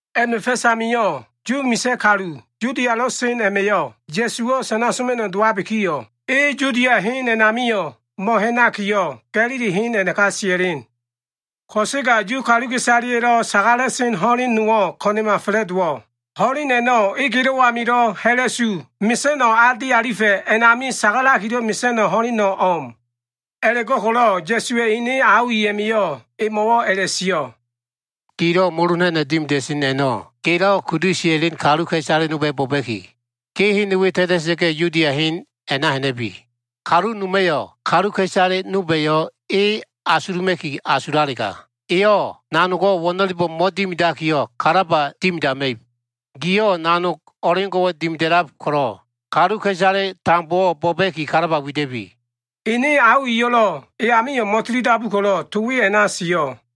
A꞉ma꞉ fa꞉s amio꞉ Yu misa꞉ kalu Yudialo꞉ sen a꞉ma꞉yo꞉ Ya꞉suwo꞉ sana soma꞉no꞉ dowabikiyo꞉, e Yudia hen a꞉namio꞉ mo꞉ha꞉nakiyo꞉, Ga꞉lili hen a꞉naka sia꞉len. Ko꞉sega Yu kaluka꞉isaleya꞉lo꞉ sagala꞉sen ho꞉len nowo꞉ ko꞉na꞉ma fa꞉la꞉dowo꞉. Ho꞉len a꞉no꞉ egelo꞉ amilo꞉ ha꞉la꞉su mesa꞉no꞉ a di alifa꞉ a꞉nami sagalakilo꞉ mesa꞉no꞉ ho꞉leno꞉ o꞉m. A꞉la꞉go꞉ko꞉lo꞉ Ya꞉suwa꞉ ene ao i a꞉ma꞉yo꞉ emo꞉wo꞉ a꞉la꞉sio꞉, “Gilo꞉ molo ha꞉na꞉no꞉ dimida꞉sen a꞉no꞉ gelo꞉ kudu sia꞉len kaluka꞉isale nolba꞉yo꞉ bo꞉ba꞉ki, ge hen we ta꞉ta꞉sa꞉ga꞉, Yudia hen a꞉na ha꞉na꞉bi. Kalu noma꞉yo꞉ kaluka꞉isale nolba꞉yo꞉ e asuluma꞉ki asulalega, eyo꞉ nanogo꞉ wo꞉no꞉lebo꞉ mo꞉dimidakiyo꞉, kalaba dimidama꞉ib. Giyo꞉ nanog o꞉leo꞉ngo꞉wo꞉ dimida꞉lab ko꞉lo꞉, kaluka꞉isale tambowo꞉ bo꞉ba꞉ki kalaba wida꞉bi!” Ene ao iyo꞉lo꞉ e amio꞉ mo꞉tilidabu ko꞉lo꞉ to we a꞉na sio꞉.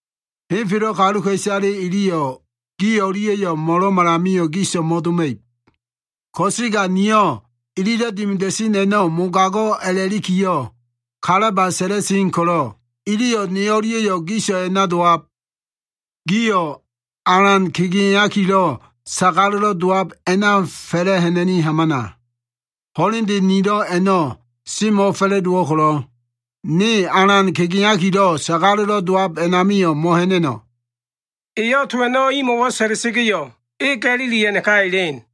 Henfelo꞉ kaluka꞉isale iliyo꞉ gi o꞉lia꞉yo꞉ mo꞉lo꞉malamio꞉ giso꞉ mo꞉doma꞉ib. Ko꞉sega niyo꞉ ililo꞉ dimida꞉sen a꞉no꞉ mogago꞉ a꞉lakiyo꞉ kalaba sa꞉la꞉sen ko꞉lo꞉ iliyo꞉ ne o꞉lia꞉yo꞉ giso꞉ a꞉na dowab. Gio꞉ alan kegeakilo꞉ sagalo꞉lo꞉ dowab a꞉na fa꞉la꞉ ha꞉na꞉ni hamana. Ho꞉lende nilo꞉ a꞉no꞉ semo꞉fa꞉la꞉dowo꞉ ko꞉lo꞉, ne alan kegeakilo꞉ sagalo꞉lo꞉ dowab a꞉namio꞉ mo꞉ha꞉na꞉no꞉.” Eyo꞉ to a꞉no꞉ imo꞉wo꞉ sa꞉la꞉sa꞉ga꞉yo꞉, e Ga꞉lili a꞉naka elen.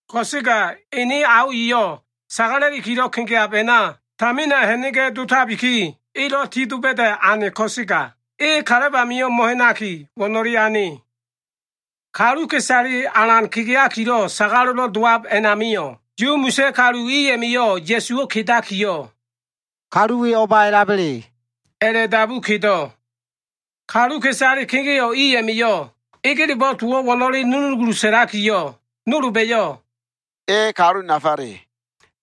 Ko꞉sega ene ao iyo꞉ sagala꞉likilo꞉ kegeab a꞉na tamina ha꞉na꞉ga꞉ dotabiki, elo꞉ tidoba꞉da꞉ ane ko꞉sega, e kalab amio꞉ mo꞉ha꞉naki, wo꞉no꞉le ane. Kaluka꞉isale alan kegeakilo꞉ sagalo꞉lo꞉ dowab a꞉namio꞉, Yu misa꞉ kalu i a꞉ma꞉yo꞉ Ya꞉suwo꞉ kedakiyo꞉, “Kalu we o꞉ba a꞉laba꞉le?” a꞉la꞉dabu kedo꞉. Kaluka꞉isale kegeo꞉ i a꞉ma꞉yo꞉ egelebo꞉ towo꞉ wo꞉no꞉le nunugulu sa꞉lakiyo꞉, nolba꞉yo꞉, “E kalu nafale”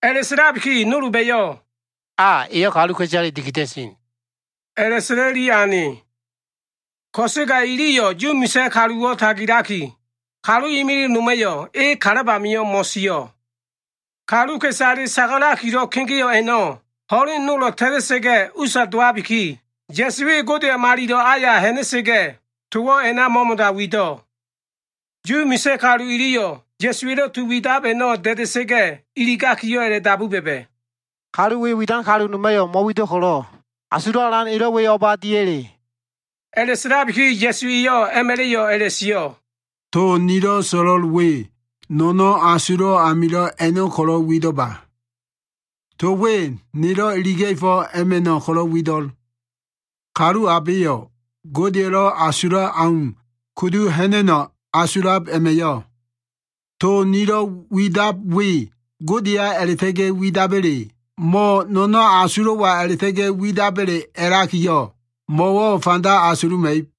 a꞉la꞉sa꞉labiki, nolba꞉yo꞉, “A, eyo꞉ kaluka꞉isaleyo꞉ dikida꞉sen” a꞉la꞉sa꞉la꞉li ane. Ko꞉sega iliyo꞉ Yu misa꞉ kaluwo꞉ tagilaki, kalu imilig noma꞉yo꞉ e kalab amio꞉ mo꞉sio꞉. Kaluka꞉isale sagalakilo꞉ kegeo꞉ a꞉no꞉ ho꞉len nolo꞉ ta꞉ta꞉sa꞉ga꞉ usa dowabiki, Ya꞉su e Godeya꞉ malilo꞉ aya ha꞉na꞉sa꞉ga꞉, towo꞉ a꞉na mo꞉mo꞉da wido꞉. Yu misa꞉ kalu iliyo꞉ Ya꞉suwa꞉lo꞉ to widab a꞉no꞉ da꞉da꞉sa꞉ga꞉ iligakiyo꞉ a꞉la꞉dabu ba꞉ba꞉, “Kalu we widan kalu noma꞉yo꞉ mo꞉wido꞉ ko꞉lo꞉, asulo꞉ alan elo꞉ we o꞉ba diya꞉le?” A꞉la꞉sa꞉labiki Ya꞉su eyo꞉ a꞉ma꞉la꞉yo꞉ a꞉la꞉sio꞉, “To nilo꞉ so꞉lo꞉l we, no꞉no꞉n asulo꞉ amilo꞉ a꞉no꞉ ko꞉lo꞉ wido꞉lba. To we nelo꞉ iliga꞉fo꞉ a꞉ma꞉no꞉ ko꞉lo꞉ wido꞉l. Kalu abeyo꞉ Godeya꞉lo꞉ asulab au kudu ha꞉na꞉no꞉ asulab a꞉ma꞉yo꞉, to nilo꞉ widab we Godeya a꞉la꞉ta꞉ga꞉ widaba꞉le mo꞉ no꞉no꞉n asulo꞉wa a꞉la꞉ta꞉ga꞉ widaba꞉le a꞉lakiyo꞉ mo꞉wo꞉ fanda asuluma꞉ib.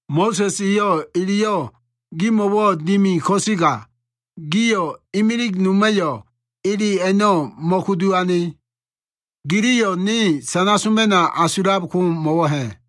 Mo꞉sa꞉s eyo꞉ eleyo꞉ gimo꞉wo꞉ dimi ko꞉sega, gio꞉ imilig noma꞉yo꞉ ele a꞉no꞉ mo꞉kudu ane. Giliyo꞉ ne sana soma꞉no꞉ asulab ko mo꞉wo꞉ ha꞉?”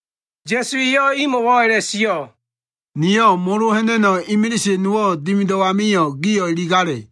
Ya꞉su eyo꞉ imo꞉wo꞉ a꞉la꞉sio꞉, “Niyo꞉ molo ha꞉na꞉no꞉ imilise nowo꞉ dimido꞉ amio꞉, gio꞉ iligale.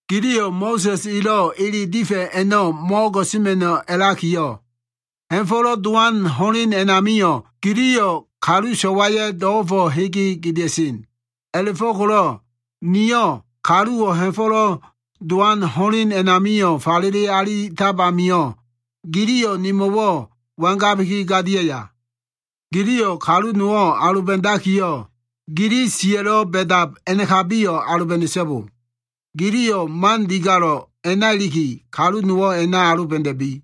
Giliyo꞉ Mo꞉sa꞉s elo꞉ ele difa꞉ a꞉no꞉ mo꞉o꞉go꞉sema꞉no꞉ a꞉lakiyo꞉, Ha꞉fo꞉lo꞉ dowan ho꞉len a꞉namio꞉ giliyo꞉ kalu so꞉waya꞉ do꞉go꞉fo꞉ hege gedea꞉sen. A꞉la꞉fo꞉ko꞉lo꞉ niyo꞉ kaluwo꞉ Ha꞉fo꞉lo꞉ Dowan ho꞉len a꞉nami falele alitab amio꞉, giliyo꞉ nemo꞉wo꞉ wangabiki gadiaya? Giliyo꞉ kalu nowo꞉ aloba꞉dakiyo꞉, gili siya꞉lo꞉ ba꞉dab a꞉nakabiyo꞉ aloba꞉da꞉so꞉bo. Giliyo꞉ man digalo꞉ a꞉na iliki, kalu nowo꞉ a꞉na aloba꞉da꞉bi.”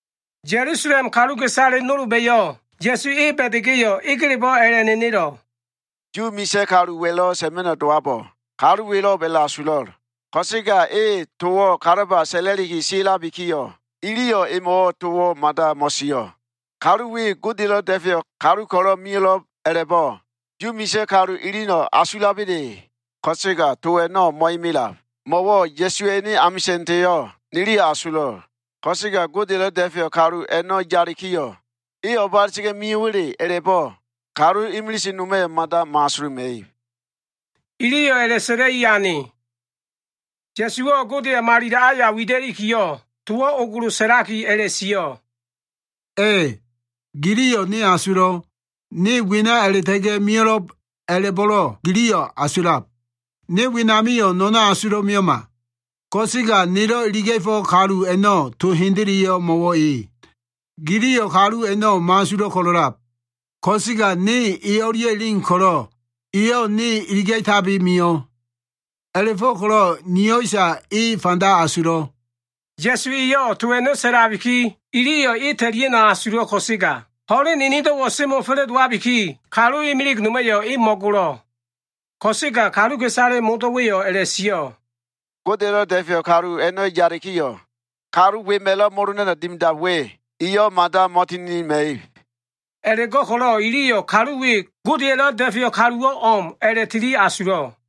Ya꞉lusalem kaluka꞉isale nolba꞉yo꞉ Ya꞉su e ba꞉da꞉ga꞉yo꞉, egelebo꞉ a꞉la꞉nenelo꞉, “Yu misa꞉ kaluwa꞉lo꞉ sa꞉ma꞉no꞉ dowabo꞉ kalu welo꞉b a꞉la꞉asulo꞉. Ko꞉sega eyo꞉ towo꞉ kalaba sa꞉la꞉li siabikiyo꞉, iliyo꞉ emo꞉wo꞉ towo꞉ mada mo꞉sio꞉. Kalu we Godeya꞉lo꞉ Da꞉feyo꞉ kalu ko꞉lo꞉ mio꞉lo꞉b a꞉la꞉bo꞉ Yu misa꞉ kalu iliyo꞉ asulaba꞉le? Ko꞉sega to a꞉no꞉ mo꞉imilab. Mo꞉wo꞉ Ya꞉suwa꞉ ene amisa꞉ndeyo꞉ niliyo꞉ asulo꞉. Ko꞉sega Godeya꞉lo꞉ Da꞉feyo꞉ kalu a꞉no꞉ yalikiyo꞉, e o꞉ba a꞉la꞉ta꞉ga꞉ mio꞉wa꞉le a꞉la꞉bo꞉ kalu imilise noma꞉yo꞉ mada mo꞉asuluma꞉ib.” Iliyo꞉ a꞉la꞉sa꞉la꞉i ane. Ya꞉suwo꞉ Godeya꞉ malilo꞉ aya wida꞉likiyo꞉, towo꞉ ogolo sa꞉lakiyo꞉, “A꞉, giliyo꞉ ne asulo꞉. Ne wena a꞉la꞉ta꞉ga꞉ mio꞉lo꞉b a꞉la꞉bo꞉lo꞉ giliyo꞉ asulab. Ne wenamio꞉ no꞉no꞉n asulo꞉ mio꞉ma. Ko꞉sega nelo꞉ iliga꞉fo꞉ kalu a꞉no꞉ to hendeleyo꞉ mo꞉wo꞉ e. Giliyo꞉ kalu a꞉no꞉ mo꞉asulo꞉ ko꞉lo꞉lab. Ko꞉sega ne e o꞉lia꞉ elen ko꞉lo꞉, eyo꞉ ne iliga꞉tabi mio꞉. A꞉la꞉fo꞉ko꞉lo꞉ niyo꞉isa e fanda asulo꞉.” Ya꞉su eyo꞉ to a꞉no꞉ sa꞉labiki, iliyo꞉ e ta꞉lia꞉no꞉ asulo꞉ ko꞉sega, ho꞉len enedo꞉wo꞉ semo꞉ fa꞉la꞉dowabiki, kalu imilig noma꞉yo꞉ e mo꞉golo꞉. Ko꞉sega kaluka꞉isale modo꞉wa꞉yo꞉ a꞉la꞉sio꞉, “Godeya꞉lo꞉ Da꞉feyo꞉ kalu a꞉no꞉ yalikiyo꞉, kalu wema꞉lo꞉ molo ha꞉na꞉no꞉ dimidab we, eyo꞉ mada mo꞉tininima꞉ib.” A꞉la꞉go꞉ko꞉lo꞉ iliyo꞉ kalu we Godeya꞉lo꞉ Da꞉feyo꞉ kaluwo꞉ o꞉m a꞉la꞉tili asulo꞉.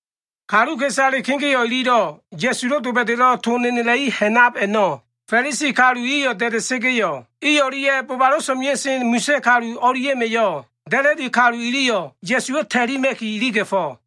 Kaluka꞉isale kegeo꞉ ililo꞉ Ya꞉sulo꞉ doba꞉da꞉lo꞉ to nenela꞉li ha꞉nab a꞉no꞉ Fa꞉lisi kalu iyo꞉ da꞉da꞉sa꞉ga꞉yo꞉, i o꞉lia꞉ bobalo꞉ so꞉mea꞉sen misa꞉ kalu i o꞉lia꞉ma꞉yo꞉ da꞉la꞉di kalu iliyo꞉ Ya꞉suwo꞉ ta꞉lima꞉ki iliga꞉fo꞉.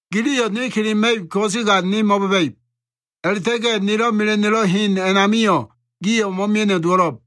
Giliyo꞉ ne kelema꞉ib ko꞉sega ne mo꞉ba꞉ba꞉ib. A꞉la꞉ta꞉ga꞉ nelo꞉ mela꞉no꞉lo꞉ hen a꞉namio꞉, gio꞉ mo꞉mia꞉no꞉ dowo꞉lo꞉b.”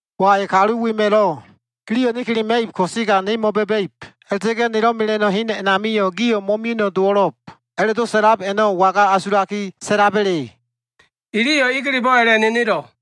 Wai! Kalu wema꞉lo꞉, ‘Giliyo꞉ ne kelema꞉ib ko꞉sega ne mo꞉ba꞉ba꞉ib. A꞉la꞉ta꞉ga꞉ nelo꞉ mela꞉no꞉ hen a꞉namio꞉, gio꞉ mo꞉mia꞉no꞉ dowo꞉lo꞉b’ a꞉la꞉do꞉ sa꞉lab a꞉no꞉ waga asulaki sa꞉laba꞉le?” Iliyo꞉ egelebo꞉ a꞉la꞉nenelo꞉.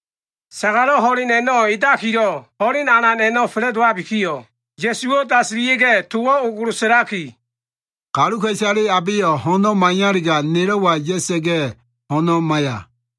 Sagalo꞉ ho꞉len a꞉no꞉ edakilo꞉ ho꞉len alan a꞉no꞉ fa꞉la꞉dowabikiyo꞉, Ya꞉suwo꞉ dasilia꞉ga꞉ towo꞉ ogolo sa꞉laki, “Kaluka꞉isale abeyo꞉ ho꞉no꞉ maiyalega, nelo꞉wa ya꞉sa꞉ga꞉ ho꞉no꞉ maiya.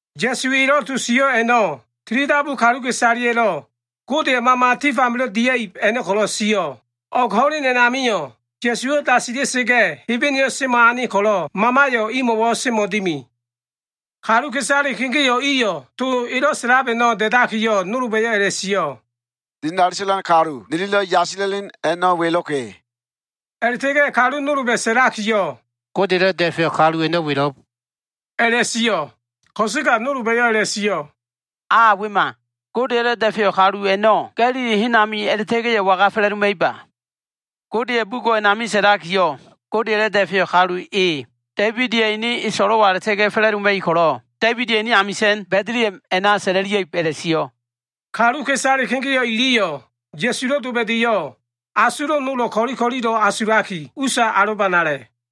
Ya꞉su elo꞉ to sio꞉ a꞉no꞉, tilidabu kaluka꞉isaleya꞉lo꞉ Godeya꞉ Mama tif amilo꞉ dia꞉ib a꞉no꞉ ko꞉lo꞉ sio꞉. O꞉g ho꞉len a꞉namio꞉, Ya꞉suwo꞉ dasila꞉sa꞉ga꞉ Hebeneyo꞉ semo꞉ ane ko꞉lo꞉, Mamayo꞉ imo꞉wo꞉ semo꞉ dimi. Kaluka꞉isale kegeo꞉ iyo꞉ to elo꞉ sa꞉lab a꞉no꞉ da꞉dakiyo꞉, nolba꞉yo꞉ a꞉la꞉sio꞉, “Dinali sa꞉lan kalu, nililo꞉ yasila꞉len a꞉no꞉ welo꞉ka꞉.” A꞉la꞉ta꞉ga꞉ kalu nolba꞉ sa꞉lakiyo꞉, “Godeya꞉lo꞉ Da꞉feyo꞉ kalu a꞉no꞉ welo꞉b” a꞉la꞉sio꞉. Ko꞉sega nolba꞉yo꞉ a꞉la꞉sio꞉, “A wema! Godeya꞉lo꞉ Da꞉feyo꞉ kalu a꞉no꞉ Ga꞉lili hen ami a꞉la꞉ta꞉ga꞉yo꞉ waga fa꞉la꞉doma꞉iba? Godeya꞉ bugo꞉ a꞉nami sa꞉lakiyo꞉, ‘Godeya꞉lo꞉ Da꞉feyo꞉ kalu e Da꞉ibida꞉ ene so꞉lo꞉wa a꞉la꞉ta꞉ga꞉ fa꞉la꞉doma꞉ib ko꞉lo꞉, Da꞉ibida꞉ ene amisa꞉n, Ba꞉diliha꞉m a꞉na sa꞉la꞉lia꞉ib’ a꞉la꞉sio꞉.” Kaluka꞉isale kegeo꞉ iliyo꞉ Ya꞉sulo꞉ doba꞉da꞉yo꞉, asulo꞉ nolo꞉ ko꞉li ko꞉lilo꞉ asulaki, usa alobanale.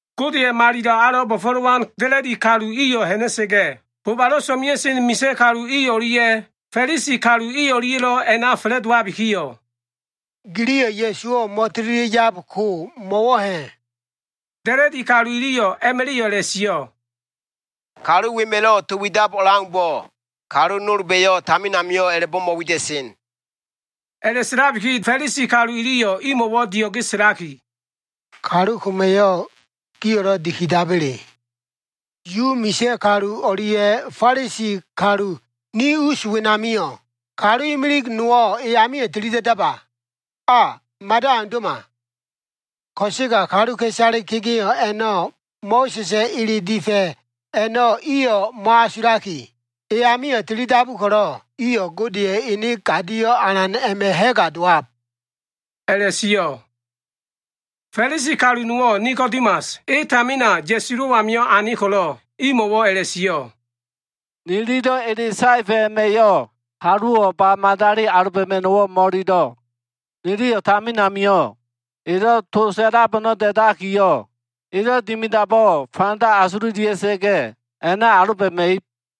Godeya꞉ malilo꞉ alo꞉ bo꞉fo꞉lowan da꞉la꞉di kalu iyo꞉ ha꞉na꞉sa꞉ga꞉, bobalo꞉ so꞉mea꞉sen misa꞉ kalu i o꞉lia꞉ Fa꞉lisi kalu i o꞉lia꞉lo꞉ a꞉na fa꞉la꞉dowabikiyo꞉, “Giliyo꞉ Ya꞉suwo꞉ mo꞉tililia꞉ yab ko mo꞉wo꞉ ha꞉?” Da꞉la꞉di kalu iliyo꞉ a꞉ma꞉la꞉yo꞉ a꞉la꞉sio꞉, “Kalu wema꞉lo꞉ to widab o꞉leaumbo꞉, kalu nolba꞉yo꞉ tamin amio꞉ a꞉la꞉bo꞉ mo꞉wida꞉sen.” A꞉la꞉sa꞉labiki Fa꞉lisi kalu iliyo꞉ imo꞉wo꞉ dio꞉ge sa꞉laki, “Kalu koma꞉yo꞉, gio꞉lo꞉ dikidaba꞉le? Yu misa꞉ kalu o꞉lia꞉ Fa꞉lisi kalu ni us wenamio꞉, kalu imilig nowo꞉ e amio꞉ tili da꞉daba? A mada aundo꞉ma! Ko꞉sega kaluka꞉isale kegeo꞉ a꞉no꞉ Mo꞉sa꞉sa꞉ ele difa꞉ a꞉no꞉ iyo꞉ mo꞉asulaki, e amio꞉ tilidabu ko꞉lo꞉, iyo꞉ Godeya꞉ ene gadio꞉ alan a꞉ma꞉ ha꞉ga dowab” a꞉la꞉sio꞉. Fa꞉lisi kalu nowo꞉ Nikodimas, e tamina Ya꞉sulo꞉ amio꞉ ane ko꞉lo꞉ imo꞉wo꞉ a꞉la꞉sio꞉, “Nililo꞉ ele saefa꞉ a꞉ma꞉yo꞉, kaluwo꞉ ba madali aloba꞉ma꞉no꞉wo꞉ mo꞉ililo꞉. Niliyo꞉ tamin amio꞉ elo꞉ to sa꞉lab a꞉no꞉ da꞉dakiyo꞉, elo꞉ dimidabo꞉ fanda asululia꞉sa꞉ga꞉, a꞉na aloba꞉ma꞉ib.”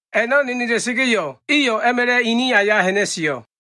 A꞉no꞉ nenela꞉sa꞉ga꞉yo꞉, iyo꞉ a꞉ma꞉la꞉ ini aya ha꞉na꞉sio꞉.